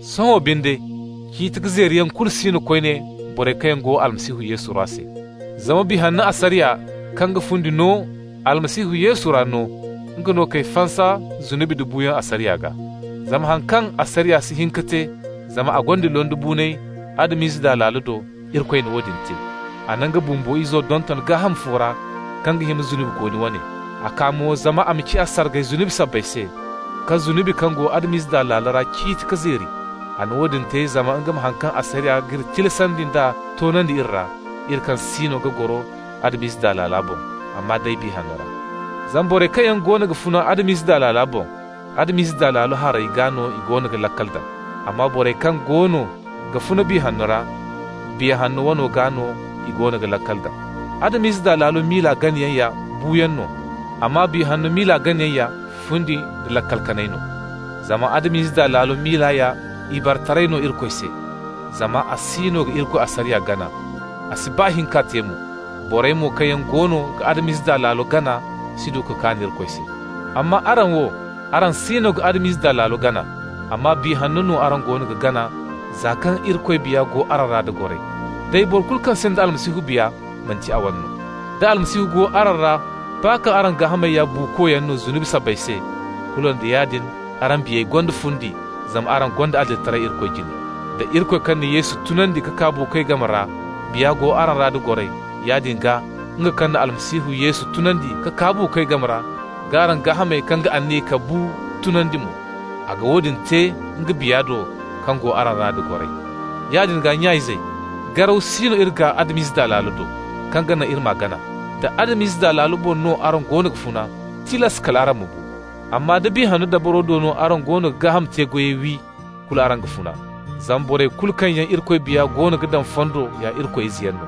Sohõ binde ciiti ka zeeriyaŋ kulu si no koyne borey kaŋ yaŋ go Almasihu Yesu ra se. Zama Biya Hanno asariya, kaŋ ga fundi no Almasihu Yesu ra no, nga no k'ay fansa zunubi nda buuyaŋ asariya gaa. Zama haŋ kaŋ asariya si hin ka te, zama a gonda londibuunay Adam-ize daa laalo do, Irikoy na woodin te. A na nga bumbo Izo donton gaaham fo ra kaŋ ga hima zunubikooni wane. A kaa mo zama a ma ciya sargay zunubi sabbay se, ka zunubi kaŋ go Adam-ize daa laalo ra ciiti k'a zeeri. A na woodin te zama nga ma haŋ kaŋ asariya g'iri tilasandi nd'a toonandi iri ra, iri kaŋ siino ga goro Adam-ize daa laalo boŋ, amma day Biya Hanno ra. Zama borey kaŋ yaŋ goono ga funa Adam-ize daa laalo boŋ, Adam-ize daa laalo harey gaa no i goono ga laakal daŋ. Amma borey kaŋ goono ga funa Biya Hanno ra, Biya Hanno wane gaa no i goono ga laakal daŋ. Adam-ize daa laalo miila ganayaŋ ya buuyaŋ no, amma Biya Hanno miila ganayaŋ ya fundi nda laakal kanay no. Zama Adam-ize daa laalo miila ya ibaretaray no Irikoy se, zama a siino ga Irikoy asariya gana, a si baa hin k'a te mo. Borey mo kaŋ yaŋ goono ga Adam-ize daa laalo gana si du ka kaan Irikoy se. Amma araŋ wo, araŋ siino ga Adam-ize daa laalo gana, amma Biya Hanno no araŋ goono ga gana, za kaŋ Irikoy Biya go araŋ ra da goray. Day boro kulu kaŋ sinda Almasihu Biya manti a wane no. Da Almasihu go araŋ ra, baa kaŋ araŋ gaahamey ya buukoyaŋ no zunubi sabbay se, kulu nda yaadin araŋ biyey gonda fundi zama araŋ gonda adilitaray Irikoy jine. Da Irikoy kaŋ na Yesu tunandi ka kaa buukoy game ra Biya go araŋ ra da goray, yaadin gaa nga kaŋ na Almasihu Yesu tunandi ka kaa buukoy game ra g'araŋ gaahamey kaŋ ga aniya ka bu tunandi mo. A ga woodin te nga Biya do kaŋ go araŋ ra da goray. Yaadin gaa, nya-izey, garaw si no iri gaa Adam-ize daa laalo do, kaŋ ga naŋ iri m'a gana. Da Adam-ize daa laalo boŋ no araŋ goono ga funa, tilas kal araŋ ma bu. Amma da Biya Hanno dabaro do no araŋ goono ga gaaham te-goyey wi, kulu araŋ ga funa. Zama borey kulu kaŋ yaŋ Irikoy Biya goono ga daŋ fondo ya Irikoy izeyaŋ no.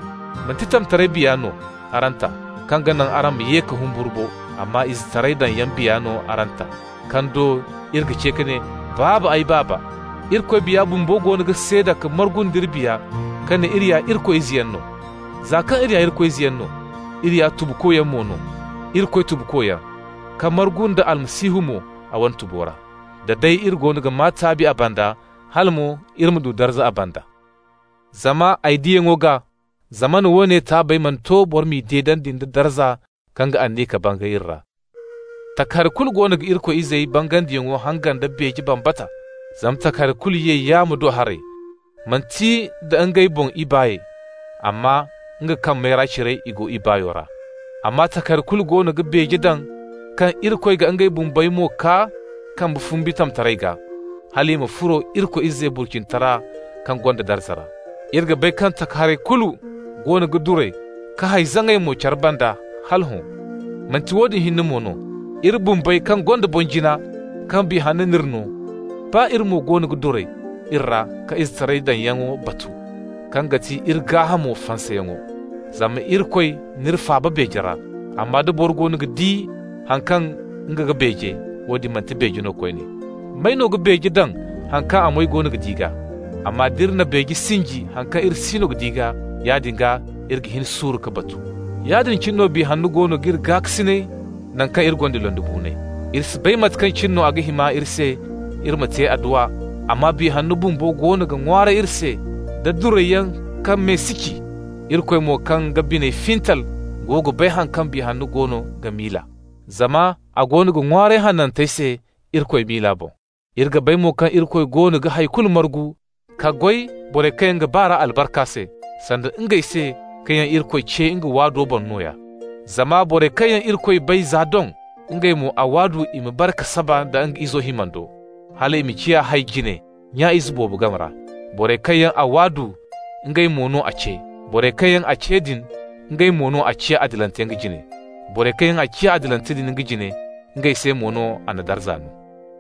Manti tamtaray biya no araŋ ta kaŋ ga naŋ araŋ ma ye ka humburu bo, amma izetaray daŋyaŋ Biya no araŋ ta, kaŋ do iri ga ce ka ne: «Baaba, ay Baaba!» Irikoy Biya bumbo goono ga seeda ka margu nd'iri biya ka ne iri ya Irikoy izeyaŋ no. Za kaŋ iri ya izeyaŋ no, iri ya tubukoyaŋ mo no, Irikoy tubukoyaŋ, ka margu nda Almasihu mo a wane tubo ra. Da day iri goono ga maa taabi a banda, hala mo iri ma du darza a banda. Zama ay diyaŋo gaa, zamana woone taabey mana to boro m'i deedandi nda darza kaŋ ga aniya ka bangay iri ra. Takahari kulu goono ga Irikoy izey bangandiyaŋo hangan da beeje bambata. Zama takahari kulu ye yaamo do haray, manti nda ngey boŋ ibaay, amma nga kaŋ mayra cire i go ibaayo ra. Amma takahari kulu goono ga beeje daŋ kaŋ Irikoy ga ngey bumbey mo kaa kambe fumbi tamtaray gaa, hal i ma furo Irikoy izey burcinitara kaŋ gonda darza ra. Iri ga bay kaŋ takaharey kulu goono ga duray ka hay zaŋay mo care banda hala hõ. Manti woodin hinne mo no. Iri bumbey kaŋ gonda boŋ-jina kaŋ Biya Hanno n'iri no, baa iri mo goono ga duray iri ra ka izetaray daŋyaŋo batu, kaŋ ga ti iri gaahamo fansayaŋo. Zama Irikoy n'iri faaba beeje ra. Amma da boro goono ga di haŋ kaŋ nga ga beeje, woodin manti beeje no koyne. May no ga beeje daŋ haŋ kaŋ a moy go ga di gaa? Amma d'iri na beeje sinji haŋ kaŋ iri siino ga di gaa, yaadin gaa iri ga hin suuru k'a batu. Yaadin cine no Biya Hanno goono g'iri gaakasinay naŋ kaŋ iri gonda londibuunay. Iri si bay mate kaŋ cine no a ga hima iri se iri ma te adduwa, amma Biya Hanno bumbo goono ga ŋwaaray iri se da durayyaŋ kaŋ me si ci. Irikoy mo kaŋ ga biney fintal go ga bay haŋ kaŋ Biya Hanno goono ga miila, zama a goono ga ŋwaaray hanantey se Irikoy miila boŋ. Iri ga bay mo kaŋ Irikoy goono ga hay kulu margu ka goy borey kaŋ yaŋ ga ba r'a albarka se, sanda ngey se kaŋ yaŋ Irikoy ce nga waado boŋ nooya. Zama borey kaŋ yaŋ Irikoy bay za doŋ, ngey mo a waadu i ma bare ka saba nda nga Izo himando, hal a ma ciya hay-jine nya-ize boobo game ra. Borey kaŋ yaŋ a waadu, ngey mo no a ce. Borey kaŋ yaŋ a ce din, ngey mo no a ciya adilante nga jine. Borey kaŋ yaŋ a ciya adilante din nga jine, ngey se mo no a na darza no.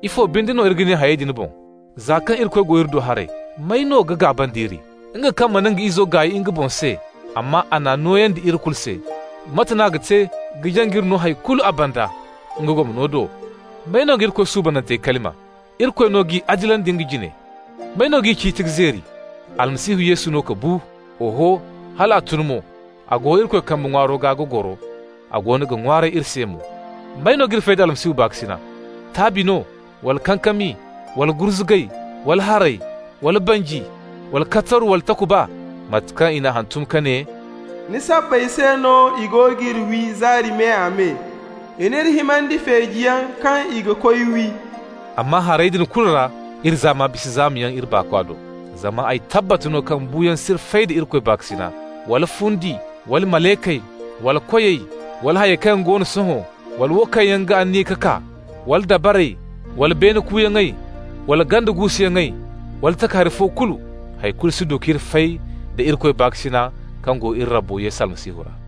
Ifo binde no iri ga ne hayey din boŋ? Za kaŋ Irikoy go iri do haray, may no ga gaaba nd'iri? Nga kaŋ mana nga Izo gaay nga boŋ se, amma a n'a nooyandi iri kulu se, mate n'a ga te ka jaŋ k'iri no hay kulu a banda nga gomno do? May no ga Irikoy suubanantey kalima? Irikoy no g'i adilandi nga jine! May no g'i ciiti ka zeeri? Almasihu Yesu no ka bu, oho, hal a tun mo, a go Irikoy kambe ŋwaaro gaa ga goro, a goono ga ŋwaaray iri se mo. May no g'iri fay da Almasihu baakasina? Taabi no? wala kankami, wala gurzugay, wala haray, wala banji, wala kataru, wala takuba? Mate kaŋ i n'a hantum ka ne: «Ni sabbay se no i go g'iri wi zaari me-a-me. I n'iri himandi feejiyaŋ kaŋ i ga koy wi.» Amma hayey din kulu ra iri zaama bisa zaamayaŋ iri baakwa do. Zama ay tabbat no kaŋ buuyaŋ s'iri fay da Irikoy baakasina, wala fundi, wala malaykey, wala koyey, wala hayey kaŋ go no sohõ, wala wo kaŋ yaŋ ga aniya ka kaa, wala dabarey, wala beene kuuyaŋey wala ganda guusuyaŋey wala takahari fo kulu. Hay kulu si du k'iri fay da Irikoy baakasina kaŋ go iri Rabbo Almasihu Yesu ra.